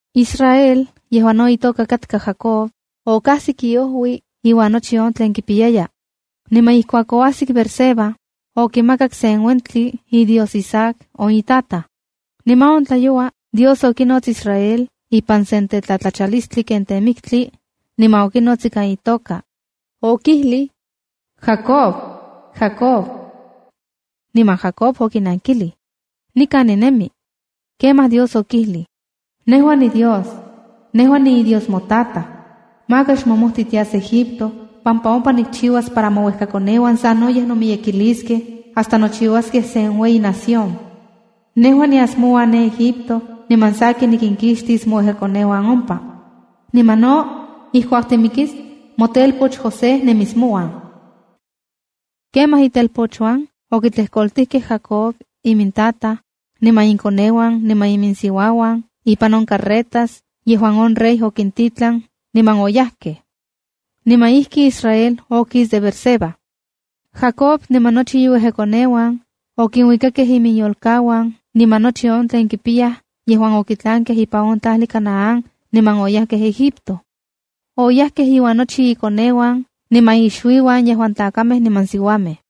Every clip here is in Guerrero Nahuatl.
Israel, yejuan no itoka katka Jacob, okajsik iojui iuan nochi on tlen kipiyaya. Niman ijkuak oajsik Beerseba, okimakak sen uentli iDios Isaac, on itataj. Niman on tlayoua Dios okinots Israel ipan sen tlatlachalistli ken temiktli, niman okinots ikan itoka. Okijlij: —¡Jacob! ¡Jacob! Niman Jacob okinankilij: —Nikan ninemi. Kemaj Dios okijlij: —Nejua niDios. Nejua niiDios motataj. Maka xmomojtij tias Egipto pampa ompa nikchiuas para mouejkakoneuan sanoyej miyekiyaskej hasta nochiuaskej sen ueyi nación. Nejua nias mouan ne Egipto, niman sakin nikinkixtis mouejkakoneuan ompa. Niman no, ijkuak timikis, motelpoch José nemis mouan. Kemaj itelpochuan okitlejkoltijkej Jacob imintataj, niman inkoneuan niman iminsiuauan ipan on carretas yejuan on rey okintitlan niman oyajkej. Niman ijki Israel okis de Beerseba. Jacob niman nochi iuejkakoneuan okinuikakej iminyolkauan niman nochi on tlen kipiyayaj yejuan okitlankej ipan on tlajli Canaán, niman oyajkej Egipto. Oyajkej iuan nochi ikoneuan niman ixuiuan yejuan tlakamej niman siuamej.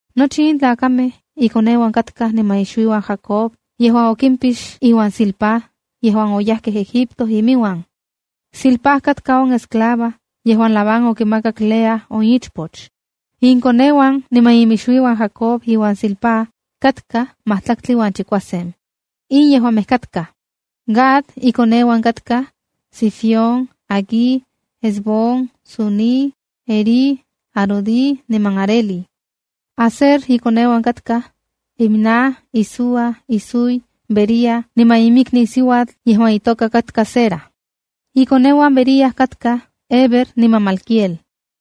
Nochi in tlakamej ikoneuan katkaj niman ixuiuan Jacob yejuan okimpix iuan Zilpá yejuan oyajkej Egipto inmiuan. (Zilpá katka on esclava yejuan Labán okimakak Lea on ichpoch.) Inkoneuan niman inmixuiuan Jacob iuan Zilpá katkaj majtlaktli uan chikuasen. In yejuamej katkaj: Gad ikoneuan katkaj: Zifión, Hagui, Ezbón, Suni, Eri, Arodi niman Areli. Aser ikoneuan katkaj: Imna, Isúa, Isúi, Bería niman iminikniu yejuan itoka katka Sera. Ikoneuan Bería katkaj: Heber niman Malquiel.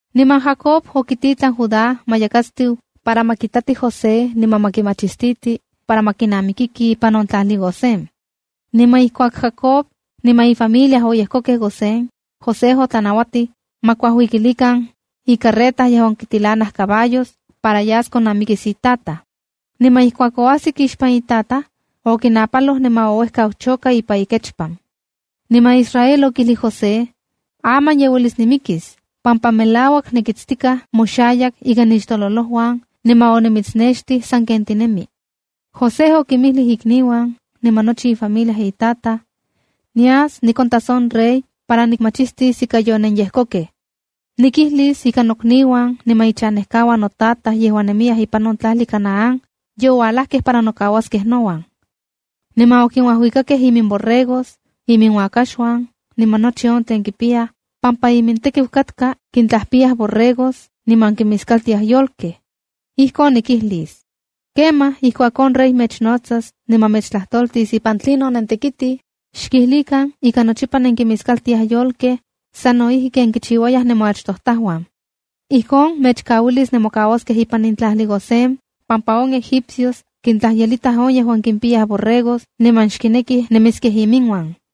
Niman Jacob okititlan Judá ma yakatstiu para ma kitati José niman ma kimachistiti para ma kinamikiki ipan on tlajli Gosén. Niman ijkuak Jacob niman ifamilia oyejkokej Gosén, José otlanauatij ma kuajuikilikan icarreta yejuan kitilanaj caballos para yas konnamikis itataj. Niman ijkuak oajsik ixpan itataj, okinapaloj niman ouejkau choka ipan ikechpan. Niman Israel okijlij José: —Aman ye uelis nimikis pampa melauak nikitstikaj moxayak ika nixtololojuan niman onimitsnextij sanken tinemi. José okinmijlij ikniuan niman nochi ifamilia itataj: —Nias nikontas on rey para nikmachistis ika yonenyejkokej. Nikijlis ika nokniuan niman ichanejkauan notataj yejuan nemiyaj ipan on tlajli Canaán ye uajlajtokej para nokauaskej nouan. Niman kinuajuikatokej iminborregos, iminuakaxuan niman nochi on tlen kipiyaj pampa imintekiu katka kintlajpiyaj borregos niman kinmiskaltiaj yolkej. Ijkon nikijlis. Kemaj ijkuak on rey mechnotsas niman mechtlajtoltis ipan tlinon nentekitij, xkijlikan ika nochipa nenkinmiskaltiaj yolkej sa no ijki ken kichiuayaj nemoachtojtajuan. Ijkon mechkauilis nemokauaskej ipan in tlajli Gosén pampa on egipcios kintlajyelitaj yejuan kimpiyaj borregos niman xkinekij nemiskej inmiuan.